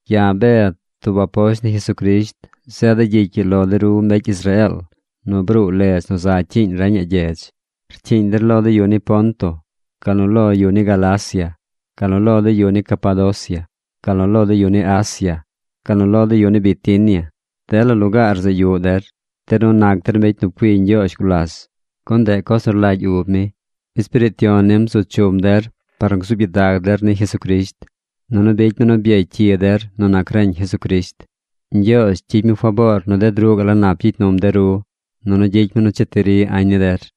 Ya̱ Bed, tub aposht ni Jesucrisht, zeeda̱ gyicy ii lo de ru mbecy Israeel nu bruu ledz nu za cyiiñ reñaꞌ gyedz. Rcyiiñ der lo de yu ni Ponto, gal nu lo yu ni Galacia, gal nu lo de yu ni Capadocia, gal nu lo de yu ni Asia, gal nu lo de yu ni Bitinia. Dela lugaar zeꞌ yuꞌ der. De ru nac der mbecy nu pcui Ñgyoozh gulas, gun ndeꞌ coz nu rlagy ub mi. Espiriit Yon nim bzu chum der par nu gzuub gyidag der ni Jesucrisht, nunu bicy mi nu byecy cyi der nu nac reñ Jesucrisht. Ñgyoozh gyicy mi faboor nu ded ruꞌ gaꞌ la nap gyicy num de ru, nunu gyicy mi nu cheti ri añ ni der.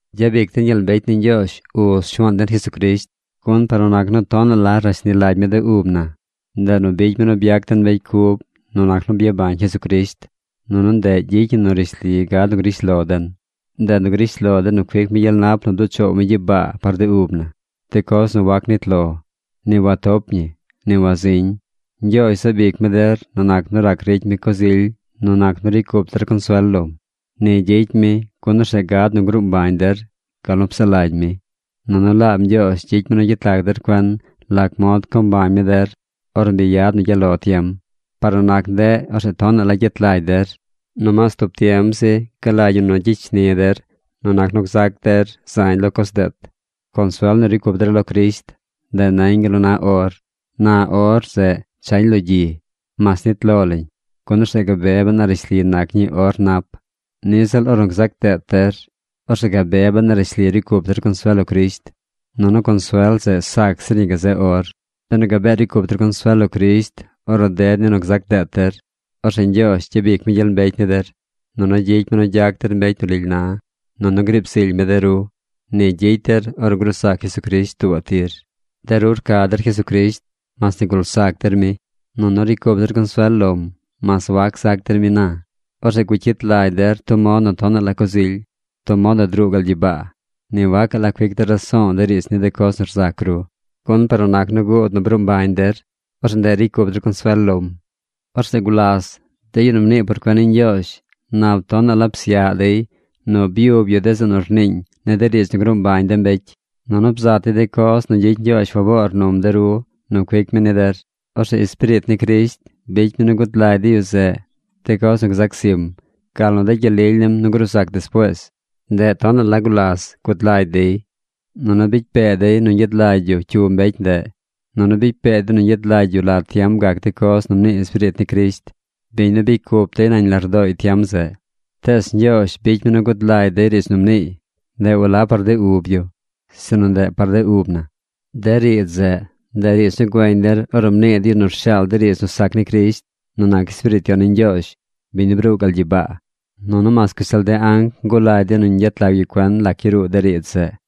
Gyabic den gyel mbecy ni Ñgyoozh Uz Shuaan den Jesucrisht, gun par nu nac nu tonaꞌ la rashni lagy mi de ub na, ndeꞌ nu bicy mi nu byac den mbecy cub nu nac nu byabañ Jesucrisht, nunu ndeꞌ gyicy ñi nu rishli gad nu grish lo den. Ndeꞌ nu grish lo den nu cuic mi gyel nap nu bduꞌ choow mi gyibaa par de ub na, de coz nu wac nit lo, ni watop ñi, ni waziñ. Ñgyoozh zaab ic mi der nu nac nu rac ricy mi coz ily nu nac nu ricy cup der consuel lom. Ni gyicy mi, gun orzeꞌ gad nu gruu mbañ der gal nu psaꞌ lagy mi. Nunu laab Ñgyoozh gyicy mi nu yet lag der cuen lac mod co mbañ mi der ornu bi yad nu gyaꞌ lo tiem. Par nu nac ndeꞌ, orzeꞌ tonaꞌ la gyet lagy der. Nomaas tub tiem zi galagy ñi nu gyicy shni der nu nac nu gzac der zañ lo coz deet. Consuel nu ricy cup der lo Crisht, ndeꞌ nañ gal nu na or. Na or zeꞌ chañ lo gyi, mas nit lo lañ, gun orzeꞌ gabe ben a rishli nac ñii or nap. Niꞌ ziꞌl ornu gzac deet der, orzeꞌ gabe ben a rishli ricy cup der consuel lo Crisht. Nunu consuel zeꞌ sac zir ñi gazeꞌ or. Benu gabee ricy cup der consuel lo Crisht ornu ded ni nu gzac deet der, orzeꞌ Ñgyoozh gyabic mi gyel mbecy ni der, nunu gyicy mi nu gyac der mbecy nu lily na, nunu griib zily mi de ru. Ni gyicy der ornu gruu zac Jesucrisht tuubaꞌ tir. De ru rca der Jesucrisht mas nigul zac der mi. Nunu ricy cup der consuel lom mas wac zac der mi na. Orzeꞌ gucyit lagy der tub mod nu tonaꞌ la coz ily. Tub mod nu druu gal gyibaa. Ni wagacaꞌ cuic der raso̱o̱ de riidz ni de coz nu rzac ru. Gun par nu nac nu guud nu bruu mbañ der, orzeꞌ ndeꞌ nu ricy cup der consuel lom. Orzeꞌ gulas de yu nu mnii por cuen ni Ñgyoozh nap tonaꞌ la psyaꞌ dey nu byub yu de zeꞌ nu rniiñ ni de riidz nu gruu mbañ de mbecy. Nunu bzat dey de coz nu gyicy Ñgyoozh faboor num de ru nu cuic mi ni der. Orzeꞌ Espiriit ni Crisht bicy mi nu gud lagy de yu zeꞌ de coz nu gzac zim, gal nu de gyel lily nim nu gruu zac despuees. Ndeꞌ tonaꞌ la gulas gud lagy dey. Nunu bicy pee dey nu ñgyad lagy yu cyu mbecy ndeꞌ. Nunu bicy pee dey nu ñgyad lagy yu la tiem gac de coz nu mnii Espiriit ni Crisht, biñ nu bicy cup dey nañ lardooy tiem zeꞌ. Tees Ñgyoozh bicy mi nu guud lagy dey riidz nu mniiy. Ndeꞌ walab par de ub yu, sinu ndeꞌ par de ub na. De riidz zeꞌ, ndeꞌ riidz nu güeñ der ornu mnii de yu nu rshaal de riidz nu sac ni Crisht nu nac Espiriit Yon ni Ñgyoozh, biñ nu bruu gal gyibaa. ¡Nunu mas gashtal de anc ngulagy dey nu ñgyet lag yu cuen lac yaruu de riidz zeꞌ!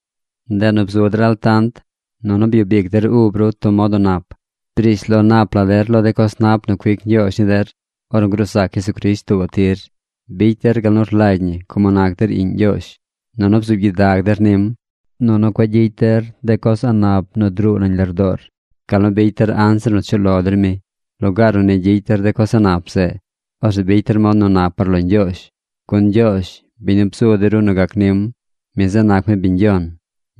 Ndeꞌ nu bzu der altant, nunu byub ic der ub ru tub mod nu nap. Brish lo nap la der lo de coz nap nu cuic Ñgyoozh ni der ornu gruu zac Jesucrisht tuubaꞌ tir. Bicy der gal nu rlagy ñi como nac der iꞌñ Ñgyoozh. Nunu bzuub gyidag der nim. Nunu cueꞌ gyicy der de coz a̱ꞌ nap nu druu nañ lardoor, gal nu bicy der anzir nu chuꞌ lo der mi. Lugaar nu gyicy der de coz a̱ꞌ nap zeꞌ, orzeꞌ bicy der mod nu nap par lo Ñgyoozh. Gun Ñgyoozh, biñ nu bzu de ru nu gac nim, mi zeꞌ nac mi biñ yon.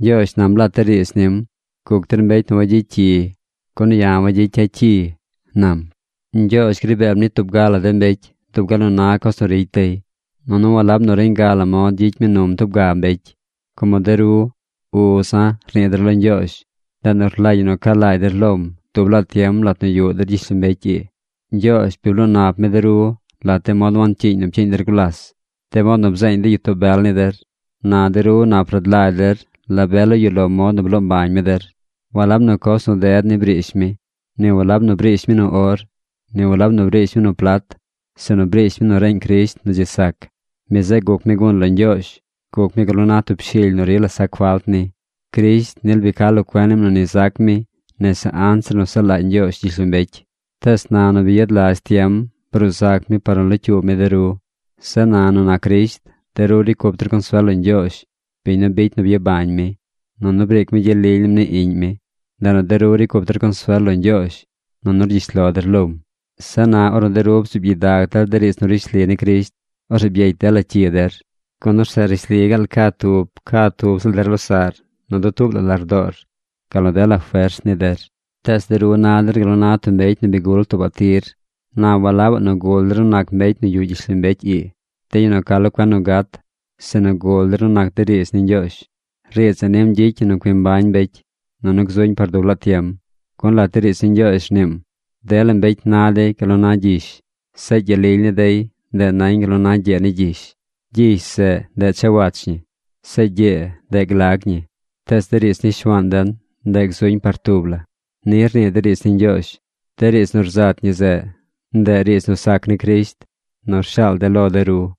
Ñgyoozh nam lat de riidz nim: “Guc der mbecy nu wagyicy cyi, gun ya̱ wagyicya̱ cyi”, nam. Ñgyoozh gri beem ni tub ga la de mbecy dub gal nu na coz nu ricy dey, nunu walab nu reñ ga la mod gyicy mi num tub ga mbecy. Como de ru “Uza̱”, rnii der lo Ñgyoozh, ndeꞌ nu rlagy ñi nu ca lagy der lom dub laa tiem lat nu yuꞌ der gyishlombecy ii. Ñgyoozh bi bloo nap mi de ru lat de mod wancyiiñ nu pcyiiñ der gulas, de mod nu bzeeñ de gyitoo bel ni der. Na de ru nap rad lagy der la be la yuꞌ lo mod nu bloo mbañ mi der. Walab nu coz nu ded ni briish mi. Ni walab nu briish mi nu or. Ni walab nu briish mi nu plat. Sinu briish mi nu reñ Crisht nu dzi sac. Mi zeꞌ guc mi gun lo Ñgyoozh. Guc mi gal nu na tub shily nu rila sac falt ni. Crisht nil bi ca lo cuen nim nu ni zac mi nese anzir nu saꞌ lagy Ñgyoozh gyishlombecy. Tees na nu bi yad lazh tiem bruu zac mi par nu locyuub mi de ru. Zeꞌ na nu nac Crisht, de ru ricy cup der consuel lo Ñgyoozh, biñ nu bicy nu byabañ mi. Nunu briic mi gyel lily nim ni Iꞌñ mi. Ndeꞌ nu de ru ricy cup der consuel lo Ñgyoozh, nunu rgyish lo der lom. Zeꞌ na ornu de ru bzuub gyidag der de riidz nu rishli ni Crisht, orzeꞌ byecy dela cyi der. Gun orzeꞌ rishli gaal ca tub ca tub ziꞌl der losaꞌr nu dutuub la lardoor, gal nu dela fers ni der. Tees de ru na der gal nu na mbecy nu bi gul tuubaꞌ tir. Na walabaꞌ nu gul der nu nac mbecy nu yuꞌ gyishlombecy ii, de yu nu ca lo cuen nu gat, sinu gul der nu nac de riidz ni Ñgyoozh. Riidz zeꞌ nim gyicy ñi nu cui mbañ mbecy, nunu gzuñ par dub laa tiem. Gun lat de riidz ni Ñgyoozh rniim: Dela mbecy na dey gal nu na gyish. Zeꞌ gyel lily ni dey, ndeꞌ nañ gal nu na gyee ni gyish. Gyish zeꞌ, ndeꞌ chawach ñi. Zeꞌ gyee, ndeꞌ glag ñi. Tees de riidz ni Shuaan den, ndeꞌ gzuñ par tub la. Ni rnii de riidz ni Ñgyoozh. De riidz nu rzat ñi zeꞌ, ndeꞌ riidz nu sac ni Crisht nu rshaal de̱ lo de ru.